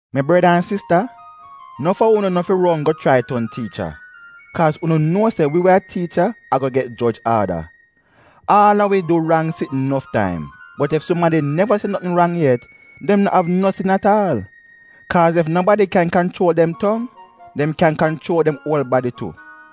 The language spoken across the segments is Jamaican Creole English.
Mi breda an sista, nof a unu no fi ron go chrai ton tiicha, kaaz unu nuo se wi we a tiicha ago get joj aada. Aal a wi du rang sitn nof taim. Bot ef sumadi neva se notn rang yet dem no av no sin at aal. Kaaz ef nobadi kyan kanchuol dem tong dem kyan kanchuol dem uol badi tu.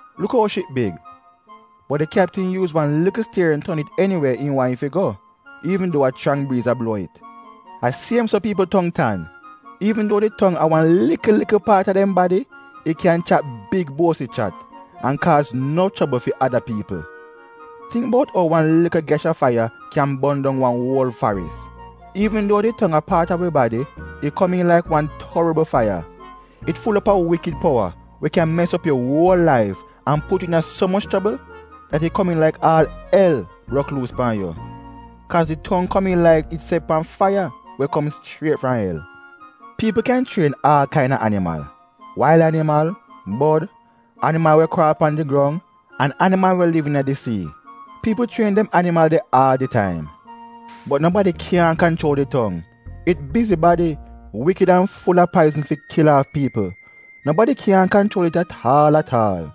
Luk ou ship big, bot di kyaptin yuuz wan likl stierin ton it eniwe im waahn it fi go, iivn duo a chrang briiz a bluo it. A siem so piipl tong tan. Iivn duo di tong a wan likl likl paat a dem badi, it kyan chat big buosi chat, an kaaz nof chobl fi ada piipl. Tingk buot ou wan likl gyash a faiya kyan bon dong wan uol faris. Iivn duo di tong a paat a wi badi, it komiin laik wan torbl faiya. It ful op a wikid powa we kyan mes op yu uol laif an put yu iina so moch chobl dat it komiin laik aal el brok luus pan yu, kaaz di tong komiin laik it set pan faiya we kom chriet fram el. Piipl kyan chrien aal kaina animal: wail animal, bod, animal we kraal pan di grong an animal we liv iina di sii — piipl chrien dem animal de aal di taim. Bot nobadi kyaahn kanchuol di tong. It bizi-badi, wikid an ful-a paizn fi kil aaf piipl. Nobadi kyaahn kanchuol it at aal at aal.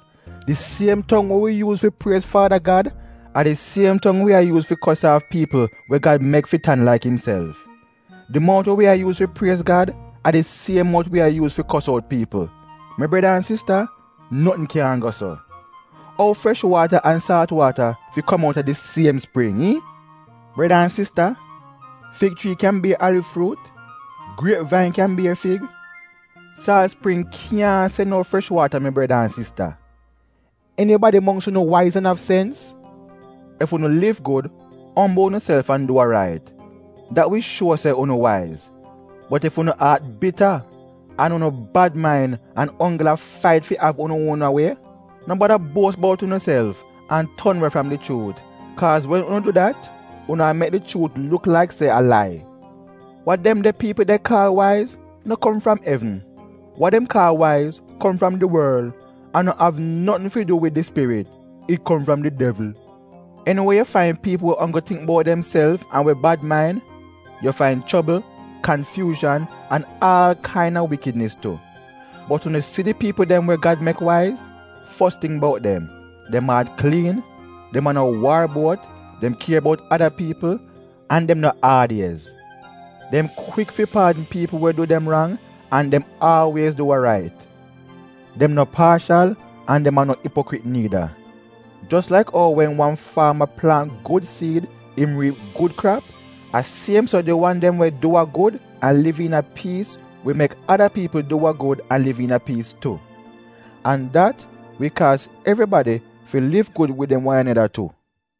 Di siem tong we wi yuuz fi priez Faada Gad, a di siem tong wi a yuuz fi kos aaf piipl we Gad mek fi tan laik imself. Di mout we wi a yuuz fi priez Gad a di siem mout wi a yuuz fi kos out piipl. Mi breda an sista, notn kyaahn go so. Ou fresh waata an saalt waata fi kom outa di siem spring, iihn? Breda an sista, fig chrii kyan bier aliv fruut? Griep vain kyan bier fig? Saalt spring kyaahn sen out fresh waata mi breda an sista! Enibadi mongks unu waiz an av sens? Ef unu liv gud, ombl unuself an du wa rait, dat wi shuo se unu waiz. Bot ef unu aat bita, an unu bad main an onggl a fait fi av unu uona wie, no bada buos bout unuself an ton we fram di chuut, kaaz wen unu du dat unu a mek di chuut luk laik se a lai. Wa dem de piipl de kaal waiz no kom fram evn. Wa dem kaal waiz kom fram di worl, an no av notn fi du wid di Spirit — it kom fram di devl. Eni we yu fain piipl we onggl tingk bout demself an we bad main, yu fain chobl, kanfyuuzhan, an aal kaina wikidnis tu. Bot unu si di piipl dem we Gad mek waiz, fos ting bout dem, dem aat kliin, dem a no waar-buot, dem kier bout ada piipl, an dem no aad-iez. Dem kwik fi paadn piipl we du dem rang, an dem aalwiez du we rait. Dem no paashal an dem a no ipokrit niida. Jos laik ou wen wan faama plaant gud siid im riip gud krap, a siem so di wan dem we du wa gud an liv iina piis wi mek ada piipl du wa gud an liv iina piis tu. An dat wi kaaz evribadi fi liv gud wid dem wan aneda tu.